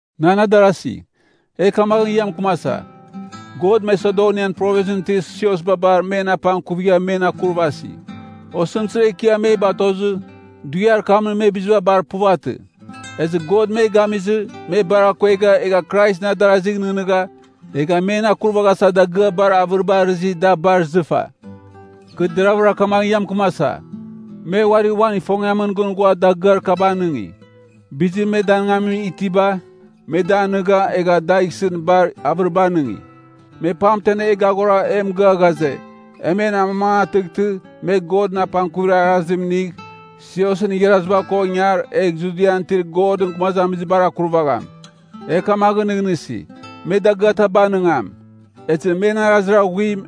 Nan adarasi, e kamaghɨn ia mɨkɨmasa, God Masedonian Provinsɨn itir siosba bar men apangkuvigha men akurvasi. Osɨmtɨzir ekiam me batozɨ, dughiar kamɨn me biziba bar puvatɨ. Ezɨ God me gamizɨ, me bar akuegha, egha Kraisɨn adarazigh nɨghnɨgha, egha men akurvaghasa dagɨar bar avɨriba arɨzi, da bar izɨfa. Kɨ deravɨra kamaghɨn ia mɨkɨmasa, me uari uan ifongiamɨn gɨn ghua dagɨar kaba anɨngi. Bizir me danɨngamin itiba, me da anɨga, egha dagh isɨn bar avɨriba anɨngi. Me pamten e gaghora e mɨgɨa ghaze, e men amamangatɨghtɨ, me Godɨn apangkuvir arazim inigh, siosɨn igharaziba ko ingar, egh Judian itir Godɨn gumazamizibar akurvagham. E kamaghɨn nɨghnɨsi, me dagɨataba anɨngam. Ezɨ men arazir aghuim,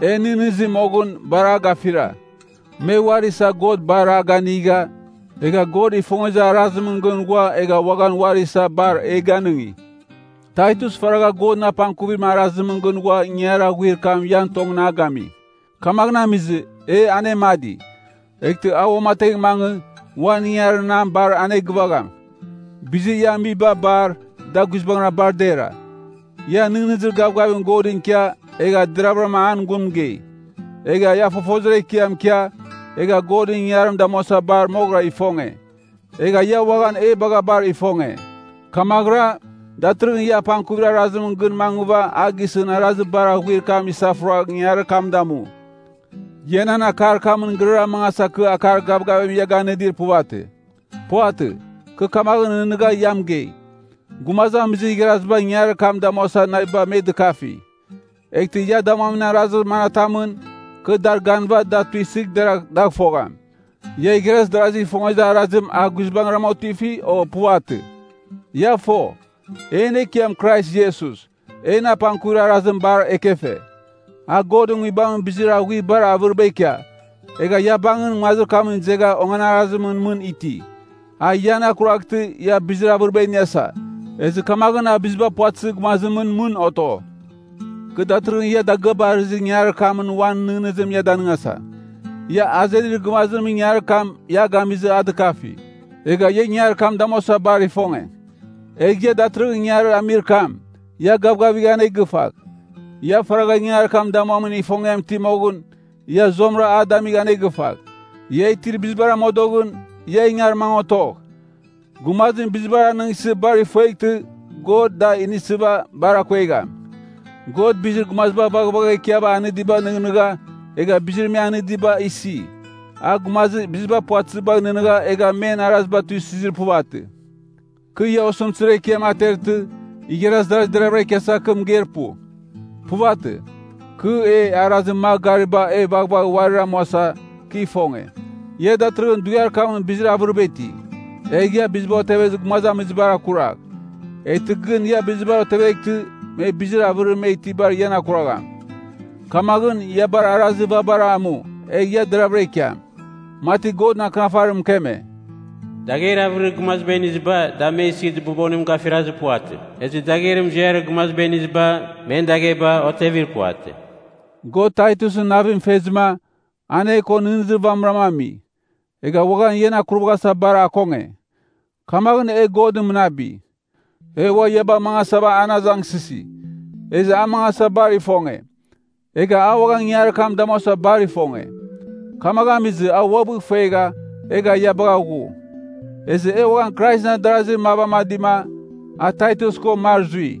en nɨghnɨzi moghɨn, bar a gafira. Me uari isa God bar a ganiga, egha God ifongezir arazimɨn gɨn ghua egha uaghan uari isa bar e ganɨngi. Taitus faragha Godɨn apangkuvir arazimɨn gɨn ghua ingangarir aghuir kam ian tongɨn a gami. Kamaghɨn amizɨ, e anemadi, eghtɨ a uamategh mangɨ, uan ingangarir nam bar anegɨvagham. Bizir ia amiba bar, da guizbangɨra bar dera. Ia nɨghnɨzir gavgavim Godɨn ikia, egha deravɨram an gun mɨgei. Egha ia fofozir ekiam ikia, egha Godɨn ingangarim damuasa bar moghɨra ifonge. Egha ia uaghan e bagha bar ifonge. Kamaghɨra, datɨrɨghɨn ia apangkuvir arazimɨn gɨn mangɨva a gisɨn arazir bar aghuir kam isafuragh ingangarir kam damu. Ia nan akar kamɨn gɨrara mangasa kɨ akar gavgavim ia ganɨdir puvatɨ. Puvatɨ, kɨ kamaghɨn nɨghnɨgha ia mɨgei, gumazamizir igharaziba ingangarir kam damuasa naviba me dɨkafi. Eghtɨ ia damuamin arazir manatamɨn, kɨ dar ganɨva da tuisɨgh deragh dagh fogham, ia igharaz darazigh ifongezir arazim a guizbangrama otifi, o puvatɨ? Ia fo, en Ekiam Krais Iesus, en apangkuvir arazim bar ekefe. A Godɨn Nguibamɨn bizir aghuir bar avɨriba ikia, egha ia bangɨn nguazir kamɨn izegha onganarazimɨn mɨn iti. A ian akuraghtɨ, ia bizir avɨriba iniasa, ezɨ kamaghɨn a biziba puvatɨzir gumazimɨn mɨn oto. Kɨ datɨrɨghɨn ia dagɨaba arɨzir ingangarir kamɨn uan nɨghnɨzim ia danɨngasa. Ia azenir gɨvazimɨn ingangarir kam ia a gamizɨ a dɨkafi. Egha ia ingangarir kam damuasa bar ifonge. Egh ia datɨrɨghɨn ingangarir amir kam, ia gavgavigh anegɨfagh! Ia faragha ingangarir kam damuamin ifongiam iti moghɨn, ia zuamɨra a damigh anegɨfagh. Ia itir bizibar amodoghɨn, ia ingar mangɨ otogh. Gumazim bizibar anɨngsɨ bar ifueghtɨ, God da inisɨva bar akuegham. God bizir gumaziba vaghvagha ikiava anɨdibagh nɨghnɨgha, egha bizir me anɨdiba isi. A gumazir biziba puvatɨzibagh nɨghnɨgha egha men araziba tuisɨzir puvatɨ. Kɨ ia osɨmtɨzir ekiam atertɨ, igharaz darasi deravɨra ikiasa, kɨ mɨgeir pu. Puvatɨ. Kɨ e arazir magh garibara e vaghvagh uarir amuasa, kɨ ifonge. Ia datɨrɨghɨn dughiar kamɨn bizir avɨriba iti, egha ia biziba otevezir gumazamizibar akuragh. Eghtɨ gɨn ia bizibar oteveghtɨ, me bizir avɨrir me itibar ian akurvagham. Kamaghɨn, ia bar arazir vabara amu, egh ia deravɨra ikiam. Mati Godɨn Akɨnafarim mɨkeme, “Dagher avɨrir gumaziba iniziba, da me isir dɨbobonim gafirazir puvatɨ. Ezɨ dagher muziarir gumaziba iniziba, men dagheba otevir puvatɨ.” God Taitusɨn navim fezɨma, an e ko nɨghnɨzir vamɨrama ami, egha uaghan ian akurvaghasa bar akonge. Kamaghɨn e God mɨnabi. E ua ia bagh mangasava an azangsɨsi, ezɨ a mangasa bar ifonge. Egha a uaghan ingangarir kam damuasa bar ifonge. Kamaghɨn amizɨ, a uabɨ ifuegha, egha ia bagha ghu. Ezɨ e uaghan Kraisɨn adarazir mav amadima, a Taitus ko mar zui.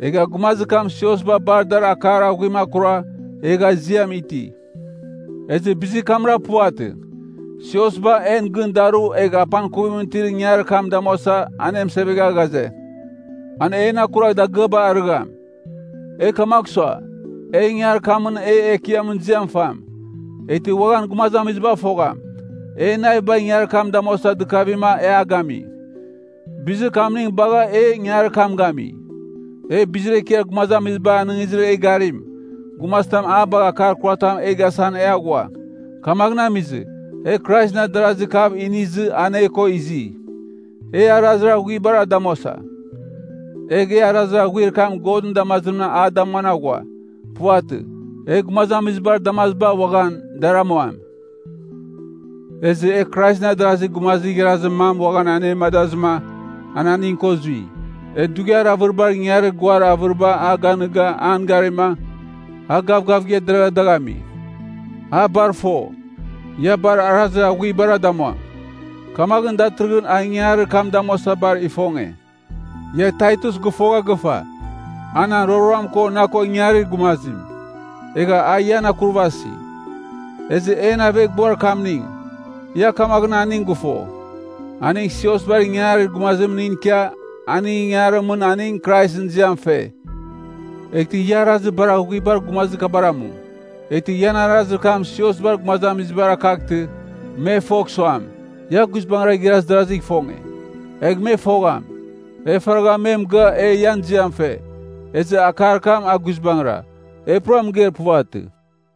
Egha gumazir kam siosba bar dar akar aghuim akura, egha iziam iti. Ezɨ bizir kamra puvatɨ. Siosba, en gɨn daru egh apangkuvim itir ingangarir kam damuasa, anemɨsevegha ghaze, an en akuragh dagɨabar arɨgham. E kamagh sua, e ingangarir kamɨn e Ekiamɨn ziam fam, eghtɨ uaghan gumazamiziba fogham, en naviba ingangarir kam damuasa dɨkavima e a gami. Bizir kamning bagha, e ingangarir kam gami. E bizir ekiar gumazamiziba anɨngizir e garim, gumazitam a bagh akar kuratam e gasan e aghua. Kamaghɨn amizɨ, e Kraisɨn adarazir kav inizɨ an e ko izi. E arazir aghuibara damuasa. Egh e arazir aghuir kam Godɨn damazimra a damuan aghua. Puvatɨ, e gumazamizibar damaziba uaghan, dar amuam. Ezɨ e Kraisɨn adarazir gumazir igharazir mam uaghan anemadazɨma, an aning ko zui. E dughiar avɨribar ingangarir guar avɨriba a ganɨga an garima, a gavgavigha deragha dagh ami. A bar fo, ia bar arazir aghuibara damuam. Kamaghɨn datɨrɨghɨn a ingangarir kam damuasa bar ifonge. Ia Taitus gɨfogha gɨfa, a nan roroam ko na ko ingarir gumazim, egha a ian akurvasi. Ezɨ en aveghbuar kamning, ia kamaghɨn aning gɨfo, aning siosbar ingangarir gumazimningɨn ikia, aningɨn ingangarimɨn aning Kraisɨn ziam fe. Eghtɨ ia arazir bar aghuibar gumazir kabar amu. Eghtɨ ian arazir kam siosbar gumazamizibar akaghtɨ, me fogh suam, ia guizbangɨra igharaz darazigh ifonge. Egh me fogham, e faragha me mɨgɨa e ian ziam fe, ezɨ akar kam, a guizbangɨra, e pura mɨgeir puvatɨ.